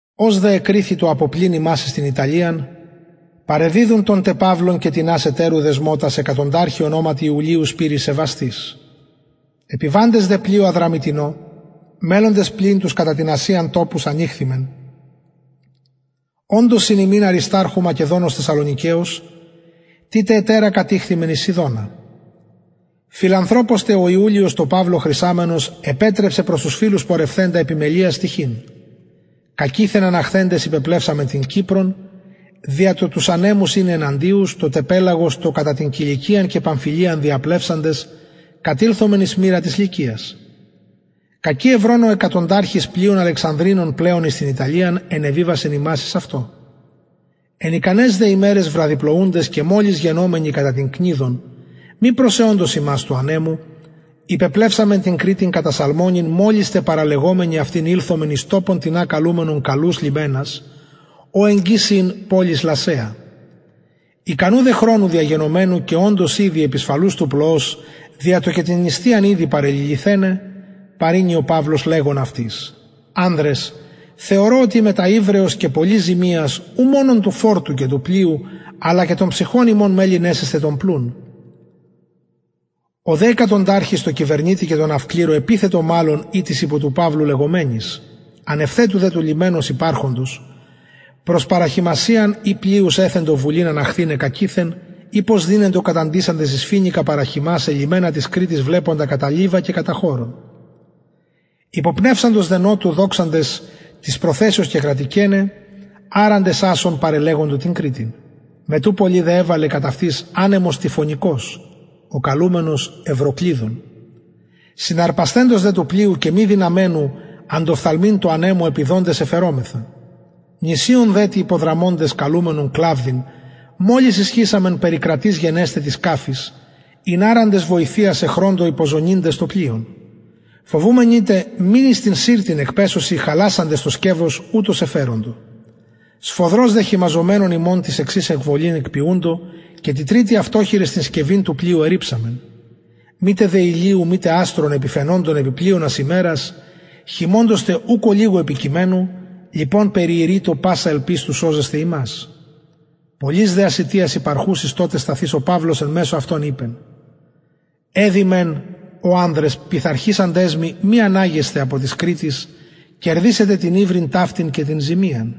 ως δε εκριθη του αποπλειν ημας εις την ιταλιαν παρεδιδουν τον τε παυλον και τινας ετερους δεσμωτας εκατονταρχη ονοματι ιουλιω σπειρης σεβαστης επιβαντες δε πλοιω αδραμυττηνω μελλοντες πλειν τους κατα την ασιαν τοπους ανηχθημεν οντος συν ημιν αρισταρχου μακεδονος θεσσαλονικεως τη τε ετερα κατηχθημεν εις σιδωνα φιλανθρωπως τε ο ιουλιος τω παυλω χρησαμενος επετρεψεν προς τους φιλους πορευθεντα επιμελειας τυχειν κακειθεν αναχθεντες υπεπλευσαμεν την κυπρον δια το τους ανεμους ειναι εναντιους το τε πελαγος το κατα την κιλικιαν και παμφυλιαν διαπλευσαντες κατηλθομεν εις μυρα της λυκιας κακει ευρων ο εκατονταρχος πλοιον αλεξανδρινον πλεον εις την ιταλιαν ενεβιβασεν ημας εις αυτο εν ικαναις δε ημεραις βραδυπλοουντες και μολις γενομενοι κατα την κνιδον μη προσεωντος ημας του ανεμου υπεπλευσαμεν την κρητην κατα σαλμωνην μολις τε παραλεγομενοι αυτην ηλθομεν εις τοπον τινα καλουμενον καλους λιμενας ω εγγυς ην πολις λασαια ικανου δε χρονου διαγενομενου και οντος ηδη επισφαλους του πλοος δια το και την νηστειαν ηδη παρεληλυθεναι παρηνει ο παυλος λεγων αυτοις ανδρες θεωρω οτι μετα υβρεως και πολλης ζημιας ου μονον του φορτιου και του πλοιου αλλα και των ψυχων ημων μελλειν εσεσθαι τον πλουν ο δε εκατονταρχης τω κυβερνητη και τω ναυκληρω επειθετο μαλλον η τοις υπο του παυλου λεγομενοις ανευθετου δε του λιμενος υπαρχοντος προς παραχειμασιαν οι πλειους εθεντο βουλην αναχθηναι κακειθεν ει πως δυναιντο καταντησαντες εις φοινικα παραχειμασαι λιμενα της κρητης βλεποντα κατα λιβα και κατα χωρον υποπνευσαντος δε νοτου δοξαντες της προθεσεως κεκρατηκεναι αραντες ασσον παρελεγοντο την κρητην μετ ου πολυ δε εβαλεν κατ αυτης ανεμος τυφωνικος ο καλουμενος ευροκλυδων συναρπασθεντος δε του πλοιου και μη δυναμενου αντοφθαλμειν τω ανεμω επιδοντες εφερομεθα νησιον δε τι υποδραμοντες καλουμενον κλαυδην μολις ισχυσαμεν περικρατεις γενεσθαι της σκαφης ην αραντες βοηθειαις εχρωντο υποζωννυντες το πλοιον φοβουμενοι τε μη εις την συρτην εκπεσωσιν χαλασαντες το σκευος ουτως εφεροντο σφοδρως δε χειμαζομενων ημων τη εξης εκβολην εποιουντο και τη τριτη αυτοχειρες την σκευην του πλοιου ερριψαμεν μητε δε ηλιου μητε αστρων επιφαινοντων επι πλειονας ημερας χειμωνος τε ουκ ολιγου επικειμενου λοιπον περιηρειτο πασα ελπις του σωζεσθαι ημας πολλης δε ασιτιας υπαρχουσης τοτε σταθεις ο παυλος εν μεσω αυτων ειπεν εδει μεν ω ανδρες πειθαρχησαντας μοι μη αναγεσθαι απο της κρητης κερδησαι τε την υβριν ταυτην και την ζημιαν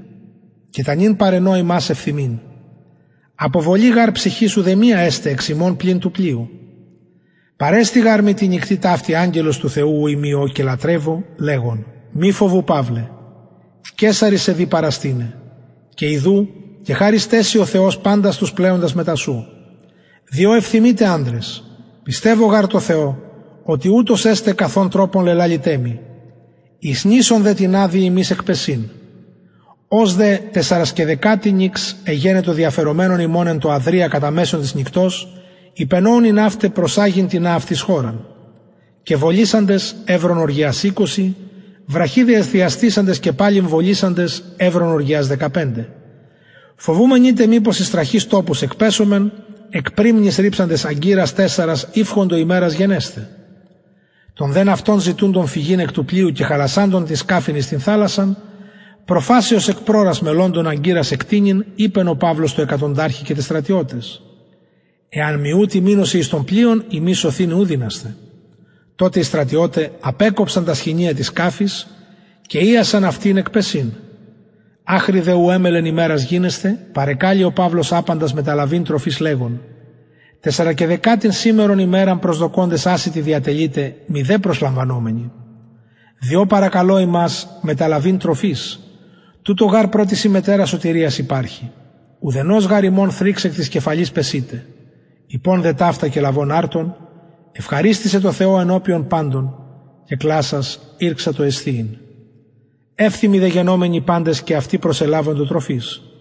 και τα νυν παραινω υμας ευθυμειν αποβολη γαρ ψυχης ουδεμια εσται εξ υμων πλην του πλοιου παρεστη γαρ μοι ταυτη τη νυκτι αγγελος του θεου ου ειμι ω και λατρευω λεγων μη φοβου παυλε καισαρι σε δει παραστηναι και ιδου κεχαρισται σοι ο θεος παντας τους πλεοντας μετα σου διο ευθυμειτε ανδρες πιστευω γαρ τω θεω οτι ουτως εσται καθ ον τροπον λελαληται μοι εις νησον δε τινα δει ημας εκπεσειν ως δε τεσσαρεσκαιδεκατη νυξ εγενετο διαφερομενων ημων εν τω αδρια κατα μεσον της νυκτος υπενοουν οι ναυται προσαγειν τινα αυτοις χωραν και βολισαντες ευρον οργυιας εικοσι βραχυ δε διαστησαντες και παλιν βολισαντες ευρον οργυιας δεκαπεντε φοβουμενοι τε μηπως εις τραχεις τοπους εκπεσωμεν εκ πρυμνης ριψαντες αγκυρας τεσσαρας ηυχοντο ημεραν γενεσθαι των δε ναυτων ζητουντων φυγειν εκ του πλοιου και χαλασαντων την σκαφην εις την θαλασσαν προφασει ως εκ πρωρας μελλοντων αγκυρας εκτεινειν ειπεν ο παυλος τω εκατονταρχη και τοις στρατιωταις εαν μη ουτοι μεινωσιν εν τω πλοιω υμεις σωθηναι ου δυνασθε τοτε οι στρατιωται απεκοψαν τα σχοινια της σκαφης και ειασαν αυτην εκπεσειν αχρι δε ου ημελλεν ημερα γινεσθαι παρεκαλει ο παυλος απαντας μεταλαβειν τροφης λεγων τεσσαρεσκαιδεκατην σημερον ημεραν προσδοκωντες ασιτοι διατελειτε μηδεν προσλαβομενοι διο παρακαλω υμας προσλαβειν τροφης τουτο γαρ προς της υμετερας σωτηριας υπαρχει ουδενος γαρ υμων θριξ εκ της κεφαλης πεσειται ειπων δε ταυτα και λαβων αρτον ευχαριστησεν τω θεω ενωπιον παντων και κλασας ηρξατο εσθιειν ευθυμοι δε γενομενοι παντες και αυτοι προσελαβοντο τροφης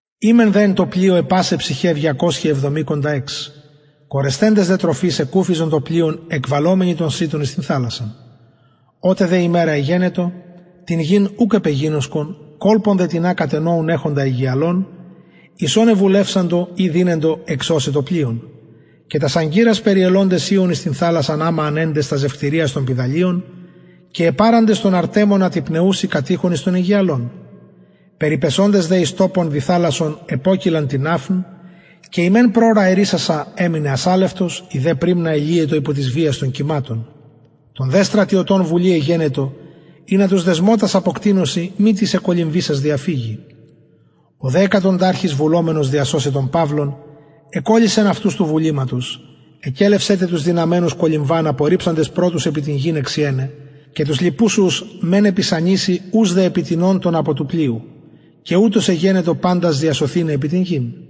ημεν δε εν τω πλοιω αι πασαι ψυχαι διακοσιαι εβδομηκοντα εξ κορεσθεντες δε της τροφης εκουφιζον το πλοιον εκβαλλομενοι τον σιτον εις την θαλασσαν οτε δε ημερα εγενετο την γην ουκ επεγινωσκον κολπον δε τινα κατενοουν εχοντα αιγιαλον εις ον εβουλευσαντο ει δυνατον εξωσαι το πλοιον και τας αγκυρας περιελοντες ειων εις την θαλασσαν αμα ανεντες τας ζευκτηριας των πηδαλιων και επαραντες τον αρτεμονα τη πνεουση κατειχον εις τον αιγιαλον περιπεσοντες δε εις τοπον διθαλασσον επωκειλαν την ναυν και η μεν πρωρα ερεισασα εμεινεν ασαλευτος η δε πρυμνα ελυετο υπο της βιας των κυματων των δε στρατιωτων βουλη εγενετο ινα τους δεσμωτας αποκτεινωσιν μη τις εκκολυμβησας διαφυγη ο δε εκατονταρχος βουλομενος διασωσαι τον παυλον εκωλυσεν αυτους του βουληματος εκελευσεν τε τους δυναμενους κολυμβαν απορριψαντας πρωτους επι την γην εξιεναι και τους λοιπους ους μεν επι σανισιν ους δε επι τινων των απο του πλοιου και ουτως εγενετο παντας διασωθηναι επι την γην